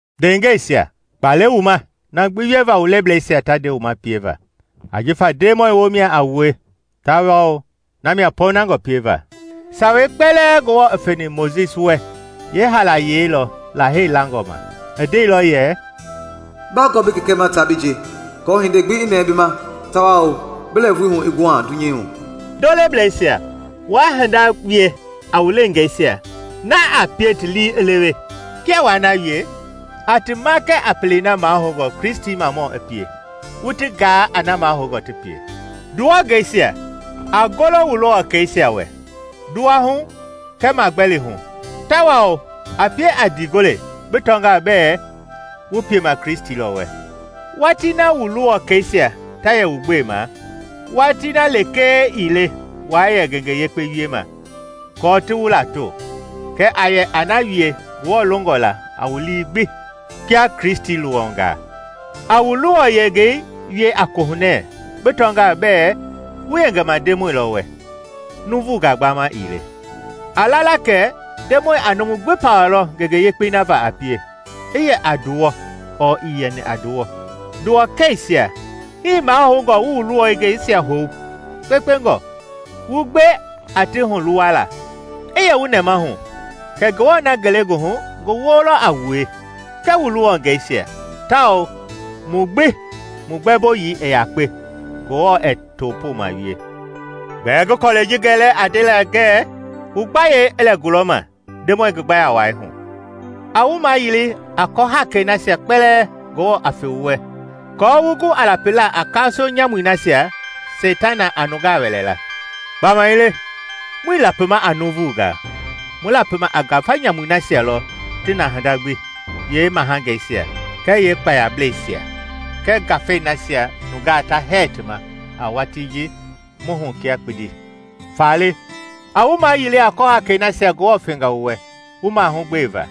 Ndeengɛisia, kpa le wu ma na gbi wieva wu leblesia ta nde wu ma pieva ajifa Ndemɔi woomia a wue, tawao namia pɔɔnangɔ pieva. Sawei kpɛlɛɛ Ngewɔ i feni Mojisi wɛ yeehaalayei lɔ Lahei langɔ ma, i ndeilɔ yɛ, “Bagɔɔ bi kɛkɛ ma taa bi nje, aako hindei gbi i nɛɛ bi ma tawao bi lɛɛvui hu i guha dunyei hu.” Ndolebleisia, waa hinda wie a wu leengeisia a pie ti lii i lewe. Kia waa na wie, a ti makɛ a pelei na mahoungɔ Kristimamɔ i pie, wu ti gaa a na mahoungɔ ti pie. Nduwɔngeisia, a golo wu luwɔkɛisia wɛ, nduwahu kɛɛ magbɛlihu; tawao a pie a ndiigole bi tɔngaa bɛɛ wu piema Kristi lɔ wɛ. Watii na wu luwɔkɛisia ta yɛ wu gbema yeewatii lekee ii le waa yɛ ngenge yekpe wiema aako ti wu lato; kɛɛ a yɛ a na wie Ngewɔ longɔ la a wu lii gbi kia Kristi luwɔngaa. A wu luwɔyengei wie a kohunɛ bi tɔngaa bɛɛ wu yengema Ndemɔi lɔ wɛ, nuuvungaa gbama ii le. A la la kɛ Ndemɔi a numu gbi pawalɔ ngenge yekpei na va a pie, i yɛ a nduwɔ ɔɔ ii yɛni a nduwɔ. Nduwɔkɛisia, hii mahoungɔ wu wu luwɔngɛisia hou kpekpengɔ; wu gbe a ti huluwala. I yɛ wu nɛmahu kɛ Ngewɔ na ngelegoohu ngi woo lɔ a wua kɛɛ wu luwɔngɛisia tawao mu gbi mu gbɛmboyii i yakpe, Ngewɔ ɛɛ topooma wie. Gbɛɛ ngi kɔlɛi ji gɛlɛ a ndela ngɛɛ, wu gbayei i lɛ gulɔma Ndemɔi ngi gbaya wai hu. A wu mayili a kɔhakei nasia kpɛlɛɛ Ngewɔ a fe wu wɛ aako wu gu a lapila a kaaso nyamui nasia Seitana a nungaa wɛlɛ la. Gbamaile muii lapima a nuuvungaa; mu lapima a ngafa nyamui nasia lɔ ti na hinda gbi, yeemahangeisia kɛɛ yeekpaayablɛisia kɛɛ ngafangei nasia nungaa ta hɛɛ ti ma a watii ji mu hu kia kpindi. Faale a wu mayili a kɔhakei nasia Ngewɔ fenga wu wɛ wu mahugbeva.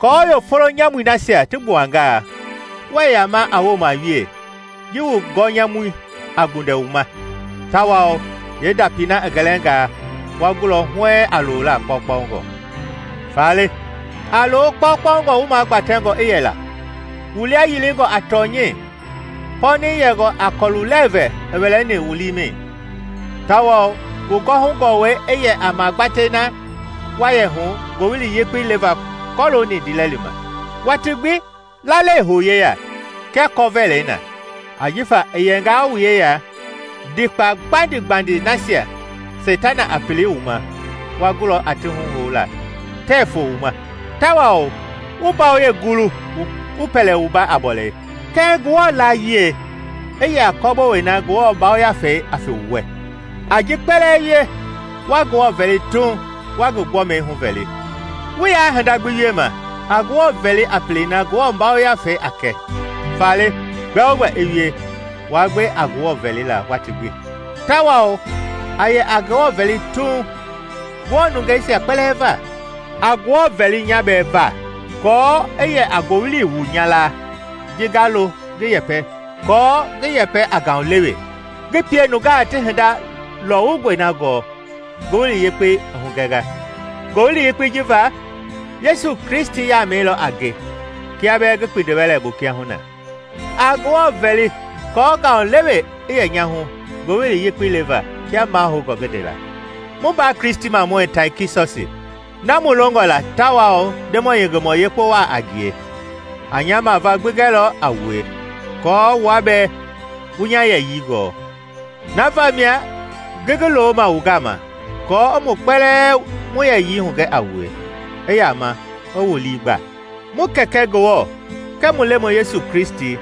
Aako yeefolo nyamui nasia ti gbuangaa, wuɛ yama a wooma we ji wu gɔnyamui a gbundɛ wu ma; tawao yeendapi na i gɛlɛngaa, wa gulɔ huɛɛŋ a loola kpaukpaungɔ. Faale a loo kpakpaungɔ wu magbatɛngɔ i yɛla, wu lia yilingɔ a tɔnyɛi, pɔɔnɛi yɛngɔ a kɔlu-lɛɛvɛ i wɛlɛni wu liimɛi, tawao wu gɔwɔhu gɔwɛi i yɛ a magbatɛi na wa yɛ hu Ngowili Yekpei leva kɔlooni ndiilɛli ma. Watii gbi lalei hou yeya kia kɔvɛlɛi na; ajifa i yɛngaa wu yeya, ndikpa gbandi-gbandi nasia Seitana a pili wu ma wa gulɔ a ti huhoula la, tɛɛ foo wu ma. Tawao wu mbayoyei gulu wu pɛlɛ wumba a bɔlei, kɛɛ Ngewɔ Yiɛi i yɛ a kɔbolei na Ngewɔ Yafei a fe wu wɛ. A ji kpɛlɛɛ wie, wa Ngewɔ vɛli Tuuŋ, wa ngi gbɔmi huvɛli. Wu yaa hinda gbi wiema a Ngewɔ vɛli a pelei na Ngewɔ Yafei a kɛ. Faale gbɛogbɛ i wie, waa gbe a Ngewɔ vɛlila waati gbi, tawao a yɛ a Ngewɔ vɛli Tuuŋ Ngewɔ nungeisia kpɛlɛɛ va. A Ngewɔ vɛli nya bɛɛ va aako i yɛ a ngowili wu nya laa ji nga lo ngi yɛpɛ aako ngi yɛpɛ a ngaulewe, ngi pie nungaa ti hinda lɔwungɔi na gɔɔ Ngowili Yekpei i hugɛnga. Ngowili Yekpei ji va, Yesu Kristi yaamei lɔ a nge kia bɛɛ ngi kpindiwɛlɛ bu kiahuna. A Ngewɔ vɛli aako ngaulewe i yɛ nya hu ngowili yekpei leva kia mahoungɔ ngi ndela. Mu mbaa Kristimamɔi Taikikɔsi, na mu longɔ la tawao Ndemɔi yengemɔ yekpe waa a ngie, a nya mavaa gbi gɛlɔ a wue, aako wua bɛɛ wu nya yɛyii gɔɔ. Na vamia ngi ngi loma wu gama aako i mu kpɛlɛɛ mu yɛyii hugɛ a wue, i yama i wu lii gba. Mu Kɛkɛ Ngewɔ kɛɛ mu Lemɔi Yesu Kristi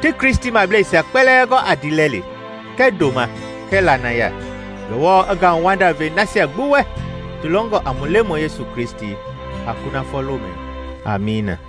ti Kristimableisia kpɛlɛɛ gɔ a ndiilɛli kɛɛ ndoma kɛɛ lanaya. Ngewɔ i ngauwanda ve nasia gbi wɛ ti longɔ a mu Lemɔi Yesu Kristi a kunafɔ lomɛi. Amiina.